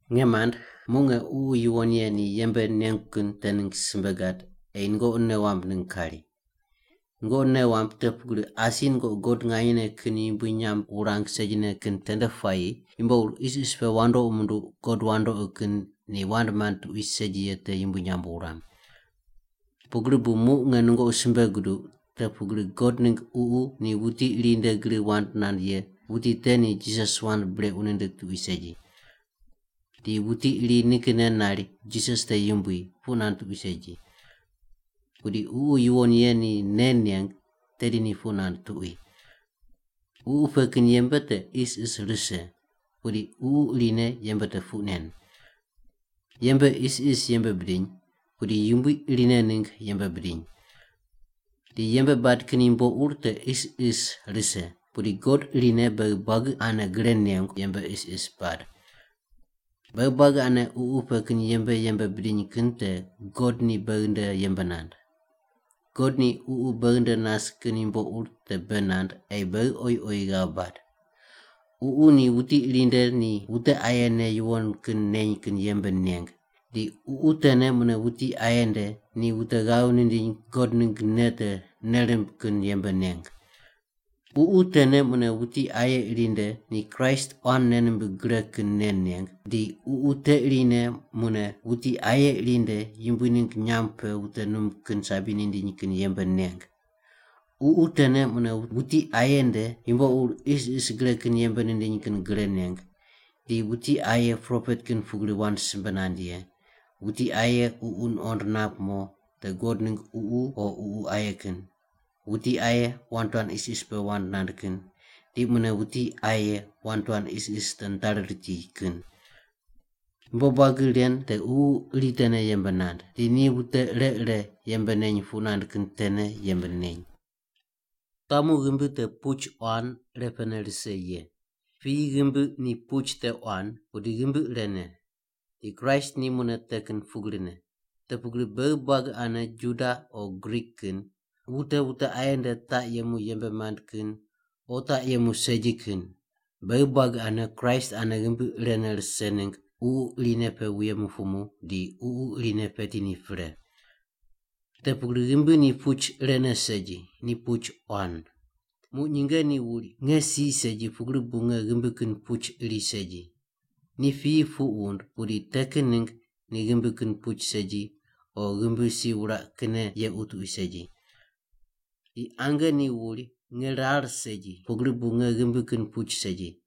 Nge mand, muq nge Ququ Yuwon Ye ni yembe nengu kin te ningg simbe gad ei nungoqi nei wamb ningg kari. Nungoqi nei wamb te pugri asi nungoqi God nganyene kin yumbui nyamb wurang segine kin tende puayi yumbo ur isis pe wandoqi munduq god wandoqi kin ni wand mand tuqui segi ye te yumbui nyamb wuram. Pugri bu muq nge nungoqi simbe guduq te pugri God ningg Ququ ni wuti iri nde gri wand nand ye wuti te ni Jisas wand brequ nindig tuqui segi. Di wuti iri nikinne nari, “Jisas te Yumbui” puq nand tuqui segi. Pudi Ququ Yuwon Ye ni nei neng tedi ni puq nand tuqui. Ququ pe kin yembe te isis rise, pudi Ququ irine yembe te puq nen. Yembe isis yembe bidiny, pudi Yumbui irine ningg yembe bidiny. Di yembe bad kin yumbo ur te isis rise, pudi God irine beghi buagi ane gre nengu yembe isis bad. Beghi buagi ane Ququ pe kin yembe yembe bidiny kin te God ni beghi nde yembe nand. God ni Ququ beghi nde nas kin yumbo ur te bei nand ei beghi oyi oyi ghav bad. Ququ ni wuti iri nde ni wute aye nei yuwon kin neny kin yembe neng, di Ququ tene mune wuti aye nde ni wute ghav nindiny God ningg nei te nei rimb kin yembe neng. Ququ tene mune wuti aye iri nde ni Kraist quan nei nimbig gre kin nei neng, di Ququ te irine mune wuti aye iri nde Yumbui ningg nyamb pe wute num kin sabi nindiny kin yembe neng. Ququ tene mune wuti aye nde yumbo ur isis gre kin yembe nindiny kin gre neng, di wuti aye propet kin pugri wand simbe nand ye, wuti aye ququ nuqond nap mo te God ningg Ququ o ququ aye kin, wuti aye wand tuan isis pe wand nand kin, di mune wuti aye wand tuan isis te nitari riti kin. Yumbo buagi ren te Ququ iri tene yembe nand. Di ni wute ire ire yembe neny puq nand kin tene yembe neny. Wutamu ghimbi te puch quan irepene rise ye. Piyi ghimbi ni puch te quan, pudi ghimbi irene. Di Kraist ni mune te kin pugrine. Te pugri beghi buagi ane Juda o Grik kin, wute wute aye nde taq yemu yembe mand kin o taq yemu segi kin, beghi buagi ane Kraist ane ghimbi irene rise ningg Ququ irine pe wuye mupumu, di Ququ irine peti ni pre. Te pugri ghimbi ni puch irene segi, ni puch quan. Muq nyinge ni wuri, “Nge si segi pugri bu nge ghimbi kin puch iri segi.” Ni piyi puq wund, pudi te kin ningg ni ghimbi kin puch segi, o ghimbi si wuraq kinne yequ tuqui segi. Di ange ni wuri, “Nge rar segi pugri bu nge ghimbi kin puch segi.”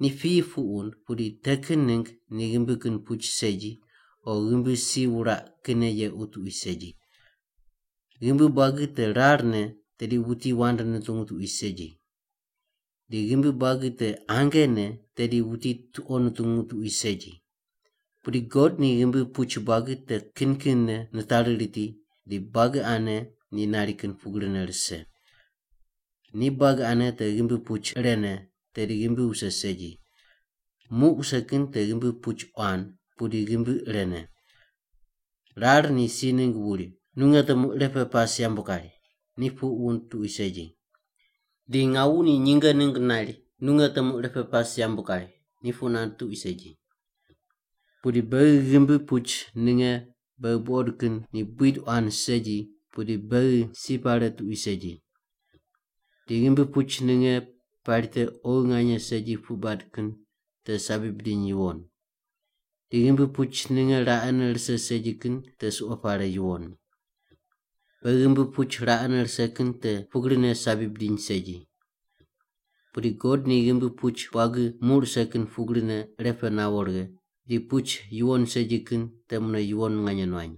Ni piyi puq wund, pudi te kin ningg ni ghimbi kin puch segi, o ghimbi si wuraq kinne yequ tuqui segi. Ghimbi buagi te rarne, tedi wuti wand nutungu tuqui segi. Di ghimbi buagi te angene, tedi wuti tuqo nutungu tuqui segi. Pudi God ni ghimbi puch buagi te kin kinne nitari riti di buagi ane ni nari kin pugrine rise. Ni buagi ane te ghimbi puch irene, tedi ghimbi wuse segi. Muq wuse kin te ghimbi puch quan, pudi ghimbi irene. Rar ni si ningg wuri, “Nu nge temu irepe pas yambu kari,” ni puq wund tuqui segi. Di ngawu ni nyinge ningg nari, “Nu nge temu irepe pas yambu kari,” ni puq nand tuqui segi. Pudi beghi ghimbi puch ninge beghi buqod kin ni buid quan segi, pudi beghi si pare tuqui segi. Di ghimbi puch ninge pari te oghi nganye segi puq bad kin te sabi bidiny yuwon. Di ghimbi puch ninge raqene rise segi kin te suqo pare yuwon. Beghi ghimbi puch raqene rise kin te pugrine sabi bidiny segi. Pudi God ni ghimbi puch buagi muq rise kin pugrine irepe nawo righe, di puch yuwon segi kin te mune yuwon nganye nuany.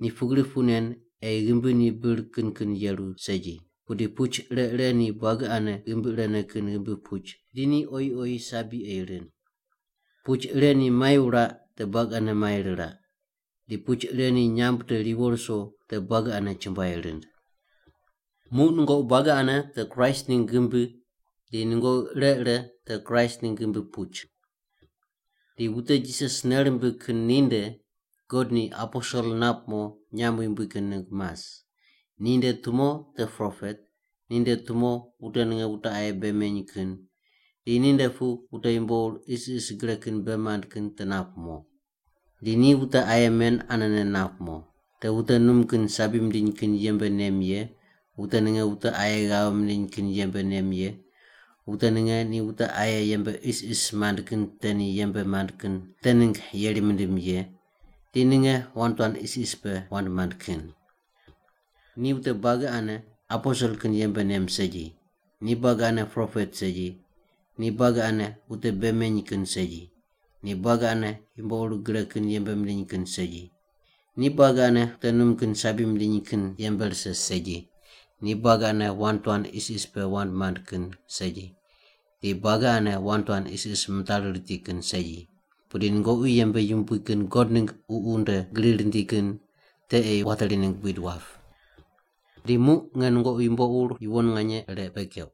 Ni pugri puq nen ei ghimbi ni bir kin kin yeru segi, pudi puch ire ire ni buagi ane ghimbi irene kin ghimbi puch di ni oyi oyi sabi ei rind. Puch ire ni mai wuraq te buagi ane mai riraq. Di puch ire ni nyamb te riwo ruso te buagi ane chumbuai rind. Muq nungoqi buagi ane te Kraist ningg ghimbi di nungoqi ire ire te Kraist ningg ghimbi puch. Di wute Jisas nei rimbig kin ninde God ni aposel nap mo nyamb yumbui kin ningg mas. Ninde tumo te propet, ninde tumo wute ninge wute aye bei meny kin, di ninde pu wute yumbo ur isis gre kin bei mand kin te nap mo. Di ni wute aye men anene nap mo: Te wute num kin sabi mindiny kin yembe nem ye, wute ninge wute aye ghav mindiny kin yembe nem ye, wute ninge ni wute aye yembe isis mand kin te ni yembe mand kin te ningg yeri mindim ye, di ninge wand tuan isis pe wand mand kin. Ni wute buagi ane aposel kin yembe nem segi, ni buagi ane propet segi, ni buagi ane wute bei meny kin segi, ni buagi ane yumbo ur gre kin yembe mindiny kin segi. Ni buagi ane wute num kin sabi mindiny kin yembe rise segi, ni buagi ane wand tuan isis pe wand mand kin segi, di buagi ane wand tuan isis mitari riti kin segi. Pudi nungoqi yembe yumbui kin God ningg Ququ nde gri rindi kin te ei wateri ningg buid wap. Di muq nge nungoqi yumbo ur yuwon nganye ire bei keuq.